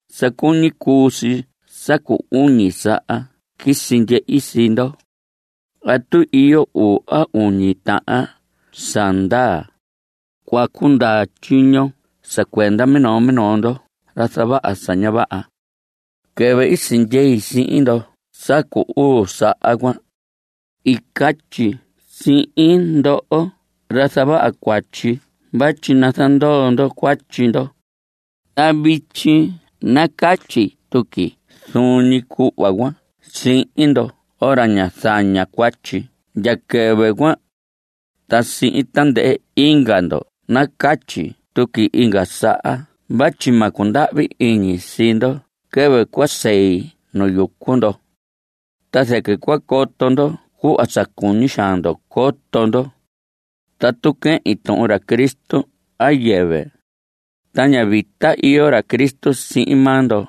Sa cuñi cuu si sa cu uñi saha quisi ndyehi sii ndo. Tatu iyo uu a uñi tahan sa ndaa, cua cundaa tyiño sa cuenda minoo minoo ndoho ra zavaha sa ña vaha. Quɨvɨ i sindyei sihin ndo sa cu uu saha cuan, i catyi sihin ndoho ra zavaha cuatyi vatyi nazandoo ndo cuatyi ndo. Ta vityi nacatyi tuqui zuun ñi cuhva cuan sihin ndoho ra ñá zaña cuatyi ndya quɨvɨ cuan. Ta sihin tandɨhɨ inga ndo nacatyi tuqui inga saha vatyi ma cundahvi iñi sii ndo quɨvɨ cua sei nu yucu ndo. Ta zɨquɨ cua coto ndo cuhva sa cuñi xaan ndo coto ndo: tatu quehin tuhun ra Cristo a yɨvɨ. Ta ña vita iyo ra Cristo sihin maa ndo,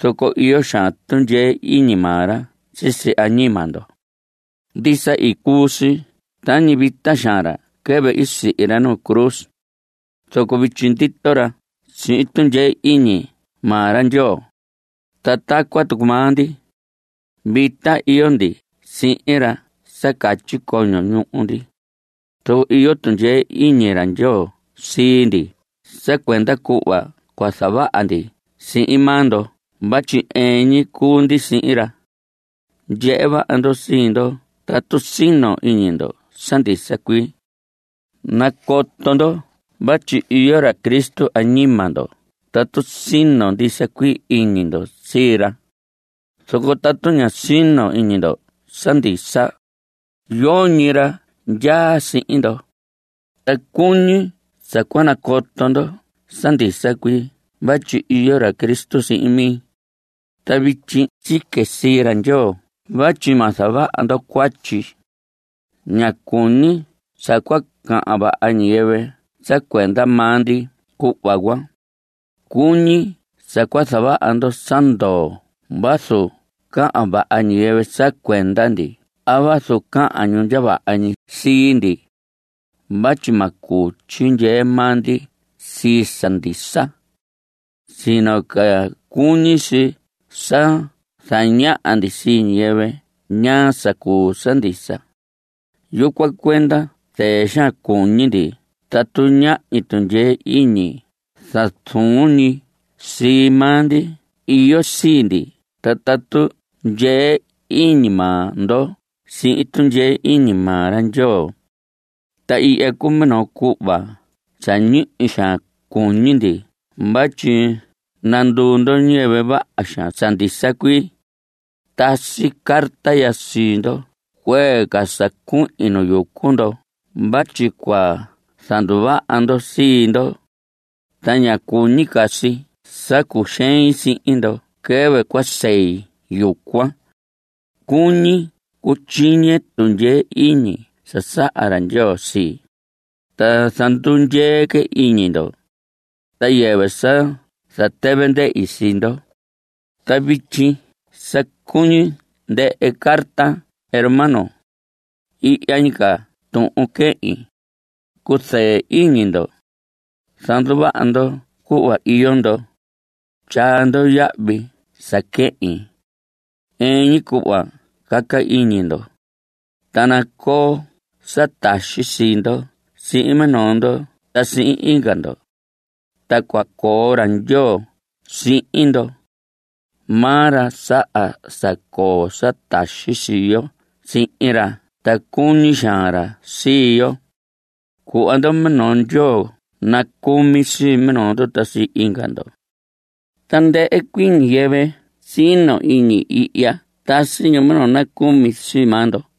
zoco iyo xaan tundyee iñi maa ra sisi añima ndo. Ndisa, i cuu si tañi vita xaan ra quɨvɨ i sihi ra nu cruz, zoco vityi ndito ra sihin tundyee iñi maa ra Ndyoo. Ta tacuan tucu maa ndi, vita iyo ndi sihin ra sa catyi coño ñuhu ndi; zoco iyo tundyee iñi ra Ndyoo sii ndi sa cuenda cuhva cua zavaha ndi sihin maa ndo vatyi ɨɨn ñi cuu ndi sihin ra. Ndyehe vaha ndo sii ndo tatu sino iñi ndo sa ndisa cuii. Nacoto ndo vatyi iyo ra Cristo añima ndo tatu sino ndisa cuii iñi ndo sii ra. Zoco tatu ña sino iñi ndo sa ndisa, yoñi ra ndyaa sihin ndo. Ta cuñi sa cua nacoto ndo sa ndisa cuii vatyi iyo ra Cristo sihin mi. Ta vityi sique sii ra Ndyoo vatyi ma zavaha ndo cuatyi. Ña cuñi sa cua cahan vaha ñiyɨvɨ sa cuenda maa ndi cuhva cuan. Cuñi sa cua zavaha ndo sa ndoo vazu cahan vaha ñiyɨvɨ sa cuenda ndi a vazu cahan ñu ndya vaha ñi sii ndi. Vatyi ma cuu tyixehe maa ndi sii sa ndisa, sino ca cuñi si sa zañaha ndi sii ñiyɨvɨ ñaa sa cuu sa ndisa. Yucuan cuenda zɨɨ xaan cuñi ndi tatu ñahñi tundyee iñi sa zuun ñi sii maa ndi iyo sii ndi ta tatu ndyee iñi maa ndo sihin tundyee iñi maa ra Ndyoo. Ta ihya cuu minoo cuhva sa ñihi xaan cuñi ndi vatyi nanduu ndo ñiyɨvɨ vaha xaan sa ndisa cuii. Tasi carta ya sii ndo cuee ca sa cuhin nu yucu ndo vatyi cua zanduvaha ndo sii ndo. Ta ña cuñi ca si sa cuxein sihin ndo quɨvɨ cua sei yucuan. Cuñi cutyiñe tundyee iñi sa saha ra Ndyoo sii, ta zandundyee que iñi ndo, ta yɨvɨ sa zatɨvɨ ndɨhi sii ndo. Ta vityi sa cuñi ndɨhɨ carte hermanos. Ihya ñi ca tuhun quehin: cuzɨɨ iñi ndo, zanduvaha ndo cuhva iyo ndo, tyaa ndo yahvi sa quehin, ɨɨn ñi cuhva caca iñi ndo, ta nacoo sa taxi sii ndo sihin minoo ndo ta sihin inga ndo. Ta cua coo ra Ndyoo sihin ndo. Maa ra saha sa coo sa taxi sii yo sihin ra ta cuñi xaan ra sii yo. Cuhva ndo minoo ndyoo nacucumi sii minoo ndo ta sii inga ndo. Tandɨhɨ cuii ñiyɨvɨ sino iñi ihya tasi ñu minoo nacumi sii maa ndo.